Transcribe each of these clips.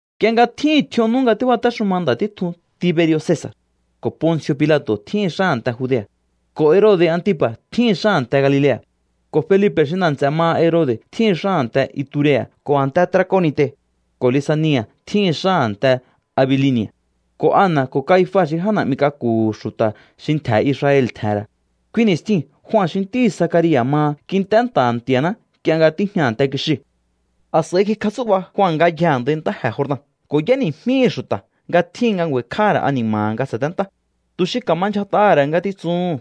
Nk'ie nga tjíhi̱n tj'ion nú nga tíbatéxuma nda̱ títjun Tiberi̱o̱ Cesa̱r, ko̱ Ponci̱o̱ Pilato̱ tjíhi̱n xá a̱nte Judea̱, ko̱ Herode̱ Atipa̱ tjíhi̱n xá a̱nte Galilea̱, ko̱ Felipe̱ xi nda̱ nts'e̱ maha Herode̱ tjíhi̱n xá a̱nte Iturea̱ ko̱ a̱nte Trakonite̱, ko̱ Lisani̱a̱ tjíhi̱n xá a̱nte Abilini̱a̱, ko̱ Ana ko̱ Caifa xi já na̱'mi k'aku̱hu̱ xu̱ta̱ xi ntje̱ Israel tje̱he̱n ra̱, kui ni̱stjiu̱n Jua xi ntíhi̱ Zacaria̱ maha kint'é nta̱ha̱ Nti̱a̱ná nk'ie nga tíjña a̱nte kixiu̱. A̱s'a̱i kikjatsú'ba Jua ngayjee̱ a̱ndai ntáje̱ Jordan ko̱ y'éni̱jmíhi̱ xu̱ta̱ nga tjíhin nga ngju̱a̱i̱kj'áha̱ ra̱ ani̱ma̱ha̱ nga sa̱téntá, tu̱ xi ka̱ma ndyjat'aha̱ ra̱ ngatitsuhu̱n.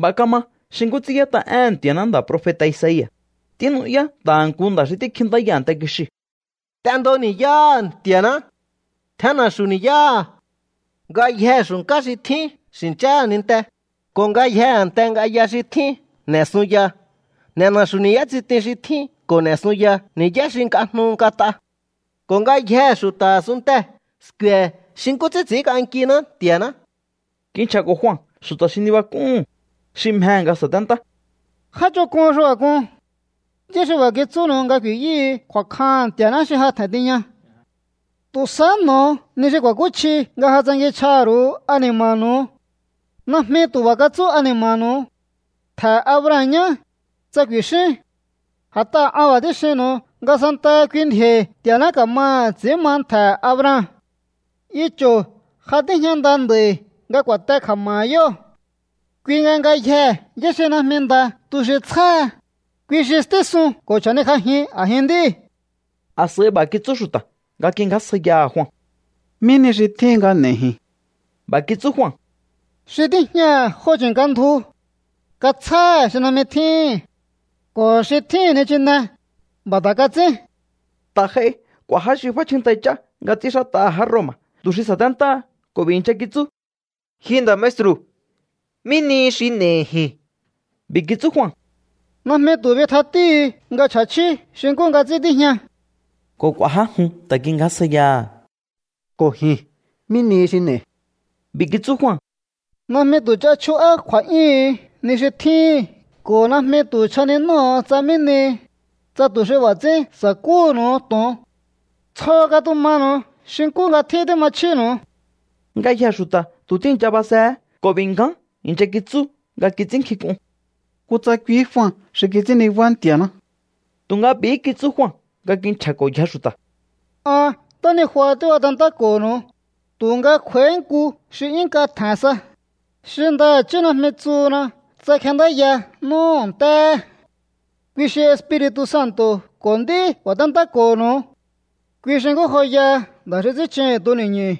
B'a̱ kama xi nkú ts'ín y'ét'a éhe̱n Nti̱a̱ná nda̱ profeta̱ Isaia̱: Tínu'yá nta̱ha̱ nku nda̱ xi tíkjintáya a̱nte kixiu̱: “T'endo ni̱yáha̱ Nti̱a̱ná. Tjen na̱xu̱u ni̱yáha̱. Ngayjee̱ xu̱nká xi tjín xi̱ncháha̱ ninte, ko̱ ngayjee̱ a̱nte ng'aya xi tjín n'e̱ sunya. N'e̱ na̱xu̱ ni̱yá tsitin xi tjín, ko̱ n'e̱ sunya ni̱yá xi nk'ajnu nk'at'a. Ko̱ ngayjee̱ xu̱ta̱ a̱sunntee̱ sku̱e̱ xi nkú ts'ín ts'i̱ínk'ankiná Nti̱a̱ná.” Kinchja̱ko̱ Jua xu̱ta̱ xi nibak'úhu̱n, xi mjehe̱ nga sa̱téntá: —¡Já ch'onk'un xi b'a̱ k'un! ¿Yá xi b'a̱ kitsúnu̱u nga ku̱i̱yúhu̱u kju̱a̱kjaha̱n Nti̱a̱ná xi ja tje̱n tiña? Tu̱ sahá n'o̱o ni xi ku̱a̱kúchji nga ja tsankinchj'aha̱ ru̱u ani̱ma̱nu̱u. Najmi tu̱ b'a̱ katsú ani̱ma̱nu̱u: “Ntje̱he̱ Abraham ñá”, tsa ku̱i̱xíún. A̱t'aha̱ an b'a̱ tíxinnu̱u nga santaha kui ndji̱o̱i̱ Nti̱a̱ná ka̱ma ts'i̱ín ma ntje̱he̱ Abraham. Icho̱ ja tíjña nda nd'a̱i̱ nga ku̱a̱te kja̱ma̱ha̱ yóo̱. Kui nga ngayjee̱ yá xi najmi nda tu xi tsjáha, kui xi stísun ko̱ chja̱nikj'ajin a̱jin nd'íu̱. A̱s'a̱i b'a̱ kitsú xu̱ta̱ nga kingjásjaiyaha̱ Jua: —¿Mí ni xi tjíhin nga n'e̱i̱ ji̱n? B'a̱ kitsú Jua: —Xi tíjñaha̱ jo chi̱nka ndju, katsjáha̱ xi najmi tjíhi̱n. Ko̱ xi tjíhi̱n nichine, b'a̱ ta̱ kats'ín. Ta̱ j'ai k'u̱a̱ já xi f'áchjíntjai ch'á nga ts'ínxát'aha̱ já Roma̱ tu̱ xi sa̱téntáha ko̱ b'i̱ i̱ncha kitsú: —Ji nda̱ maestru̱, ¿mí nihi xi n'e̱i̱ ji̱n? B'i̱ kitsú Jua: —Najmi tu̱ bitjatíúhu̱u nga chj'a̱chjíú xi nkú nga ts'ín tíjña. Ko̱ k'u̱a̱ já jun ta̱ kingjásjaiyaha̱: —Ko̱ ji̱n, ¿mí nihi xi n'e̱i̱? B'i̱ kitsú Jua: —Najmi tu̱ ch'a chju'á kju̱a̱'yúhu̱un ni xi tjíhi̱n ko̱ najmi tu̱ chjaninóho̱o tsa mí nihi, tsa tu̱ xi b'a̱ ts'ín sa̱kúhu̱nu̱u to̱on. Tsjo katumanu̱u xi nkú nga tjín tíma chjínu̱u. Ngayjee̱ xu̱ta̱ tu̱ tíi̱ncha basehé ko̱ b'i̱ ngján i̱ncha kitsú nga kits'ínnkjink'un: “Kutsa kuihí Jua xi kits'ín nibá Nti̱a̱ná.” Tu̱nga b'i̱hí kitsú Jua nga kinchja̱ko̱yje xu̱ta̱: —An ntánijua tíbatentáko̱ho̱nu̱u, tu̱nga kj'u̱a̱íhí nku xi 'yún nk'a tje̱n sa, xi ndaha̱chí najmi tsuhuna tsa kjenndáya n'úhu̱ ntéhe̱. Kui xi Espiri̱tu̱ Santo̱ ko̱ nd'í ku̱a̱téntáko̱ho̱nu̱u. Kui xi nkú joyaha nda̱ xi ts'ín chuhu̱n tuni̱ñu̱.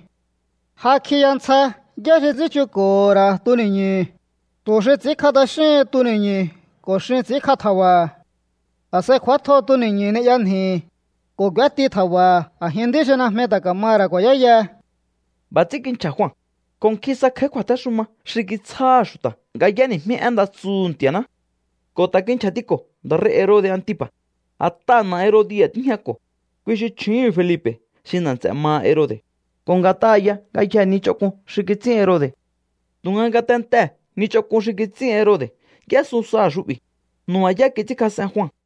Ja kjiya ntsja yá xi ts'ín chunko̱ho̱ ra̱ tuni̱ñu̱hu̱, tu̱ xi ts'i̱ínkj'a t'axíhin tuni̱ñu̱ ko̱ xin ts'i̱ínkj'a tja̱ba̱ha̱. A̱s'a̱i kj'u̱átjo tuni̱ñu̱ ni'ya nji̱hi̱, ko̱ k'u̱éti tja̱ba̱ha̱ a̱jin nd'í xi najmi ta̱ ka̱maha̱ ra̱ ku̱a̱yáyaha. B'a̱ ts'ín kinchja̱ Jua, ko̱ nkjin sa kj'a̱í kju̱a̱téxuma xi kitsjáha̱ xu̱ta̱ nga y'éni̱jmí én nda tsuhu̱ Nti̱a̱ná. Ko̱ ta̱ kinchja̱tiko̱ nda̱ rei̱ Herode̱ Antipa̱, a̱t'aha̱ na̱ Herodia̱ tíjñako̱, kui xi chju̱úhu̱n Felipe̱ xi nda̱ nts'e̱ maha Herode̱, ko̱ nga̱t'aha̱ ya ngayjee̱ ni ch'onk'un xi kits'ín Herode̱. Tu̱nga ngatentee̱ ni ch'onk'un xi kits'ín Herode̱ y'ésun saha̱ xu'bi̱. Nu̱ba̱yá kits'ínkjas'en Jua.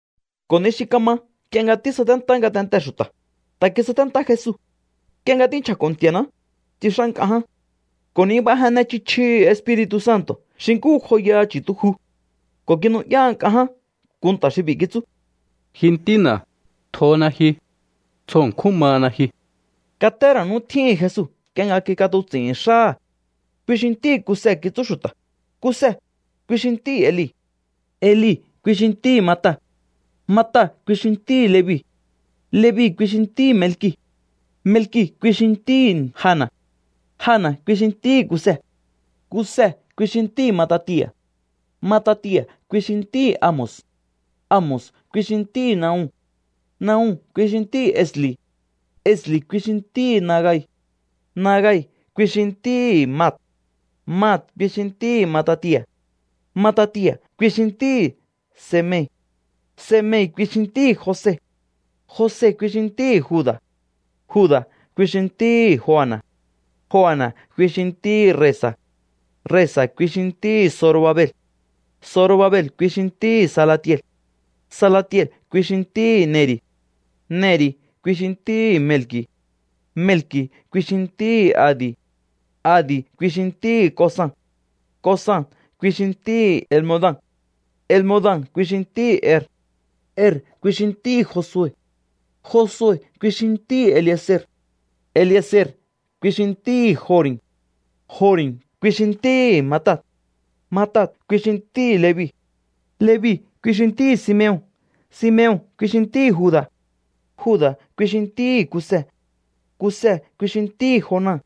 Ko̱ ni xi kama nk'ie nga tísaténtá ngatentee̱ xu̱ta̱, ta̱ kisaténtá Jesu. Nk'ie nga tínchja̱ko̱ Nti̱a̱ná, tsix'á nk'a ján ko̱ nibajenne chji chjihi̱ Espiri̱tu̱ Santo̱ xi nkú joyaha chu̱tuju. Ko̱ kinu'yá nk'a ján nku nta̱ xi b'i̱ kitsú: —Ji Ntína̱, tjona ji. Tsjo ṉkjún mana ji. Katé ra̱ nú tjíhi̱n Jesu nk'ie nga kik'atuts'i̱hi̱n xáha̱. Kui xi ntíhi̱ Kuse kitsú xu̱ta̱. Kuse, kui xi ntíhi̱ Eli. Eli, kui xi ntíhi̱ Matat. Matat, kui xi ntíhi̱ Levi. Levi, kui xi ntíhi̱ Melki̱. Melki̱, kui xi ntíhi̱ Jana̱. Jana̱, kui xi ntíhi̱ Kuse. Kuse, kui xi ntíhi̱ Matatia̱. Matatia̱, kui xi ntíhi̱ Amos. Amos, kui xi ntíhi̱ Nahum. Nahum, kui xi ntíhi̱ Esli̱. Esli̱, kui xi ntíhi̱ Nagai. Nagai, kui xi ntíhi̱ Mat. Mat, kui xi ntíhi̱ Matatia̱. Matatia̱, kui xi ntíhi̱ Semei. Semei, kui xi ntíhi̱ Jose. Jose, kui xi ntíhi̱ Juda̱. Juda̱, kui xi ntíhi̱ Joana̱. Joana̱, kui xi ntíhi̱ Resa̱. Resa̱, kui xi ntíhi̱ Zorobabel. Zorobabel, kui xi ntíhi̱ Salatiel. Salatiel, kui xi ntíhi̱ Neri̱. Neri̱, kui xi ntíhi̱ Melki̱. Melki̱, kui xi ntíhi̱ Adi̱. Adi̱, kui xi ntíhi̱ Cosam. Cosam, kui xi ntíhi̱ Elmodam. Elmodam, kui xi ntíhi̱ Er. Er, kui xi ntíhi̱ Josue. Josue, kui xi ntíhi̱ Elieze̱r. Elieze̱r, kui xi ntíhi̱ Jori̱m. Jori̱m, kui xi ntíhi̱ Matat. Matat, kui xi ntíhi̱ Levi. Levi, kui xi ntíhi̱ Simeon. Simeon, kui xi ntíhi̱ Juda̱. Juda̱, kui xi ntíhi̱ Kuse. Kuse, kui xi ntíhi̱ Jonan.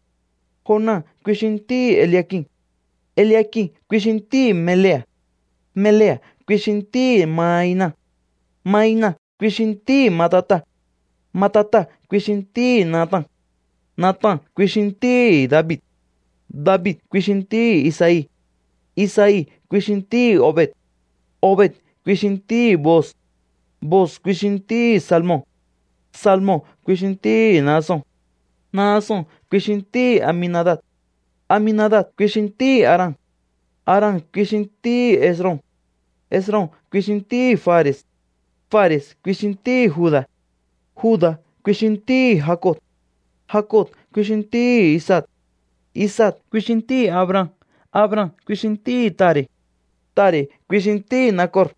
Jonan, kui xi ntíhi̱ Eliakim. Eliakim, kui xi ntíhi̱ Melea̱. Melea̱, kui xi ntíhi̱ Mainan. Mainan, kui xi ntíhi̱ Matata̱. Matata̱, kui xi ntíhi̱ Natan. Natan, kui xi ntíhi̱ David. David, kui xi ntíhi̱ Isai. Isai, kui xi ntíhi̱ Obed. Obed, kui xi ntíhi̱ Booz. Booz, kui xi ntíhi̱ Salmon. Salmon, kui xi ntíhi̱ Naason. Naason, kui xi ntíhi̱ Aminadab. Aminadab, kui xi ntíhi̱ Aram. Aram, kui xi ntíhi̱ Esrom. Esrom, kui xi ntíhi̱ Fare̱s. Fare̱s, kui xi ntíhi̱ Juda̱. Juda̱, kui ntíhi̱ Jacob. Jacob, kui xi ntíhi̱ Isaac. Isaac, kui xi ntíhi̱ Abraham. Abraham, kui xi ntíhi̱ Tare. Tare, kui xi ntíhi̱ Nakor.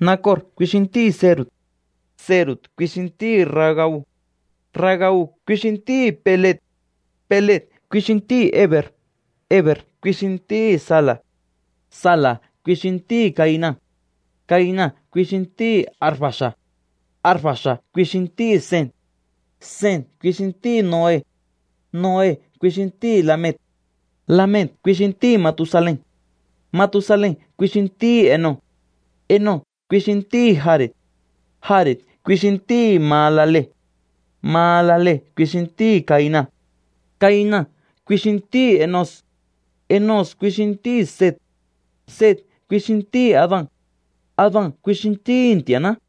Nakor, kui xi ntíhi̱ Serug. Serug, kui xi ntíhi̱ Ragau. Ragau, kui xi ntíhi̱ Peleg. Peleg, kui xi ntíhi̱ Hebe̱r. Hebe̱r, kui xi ntíhi̱ Sala̱. Sala̱, kui xi ntíhi̱ Cainan. Cainan, kui xi ntíhi̱ Arfaxa̱d. Arfaxa̱d, kui xi ntíhi̱ Sem. Sem, kui xi ntíhi̱ Noe. Noe, kui xi ntíhi̱ Lame̱c. Lame̱c, kui xi ntíhi̱ Matusalen. Matusalen, kui xi ntíhi̱ Enoc. Enoc, kui xi ntíhi̱ Jare̱d. Jare̱d, kui xi ntíhi̱ Mahalalel. Mahalalel, kui xi ntíhi̱ Cainan. Cainan, kui ntíhi̱ Enos. Enos, kui xi ntíhi̱ Set. Set, kui xi ntíhi̱ Adan. Adan, kui xi ntíhi̱ Nti̱a̱ná.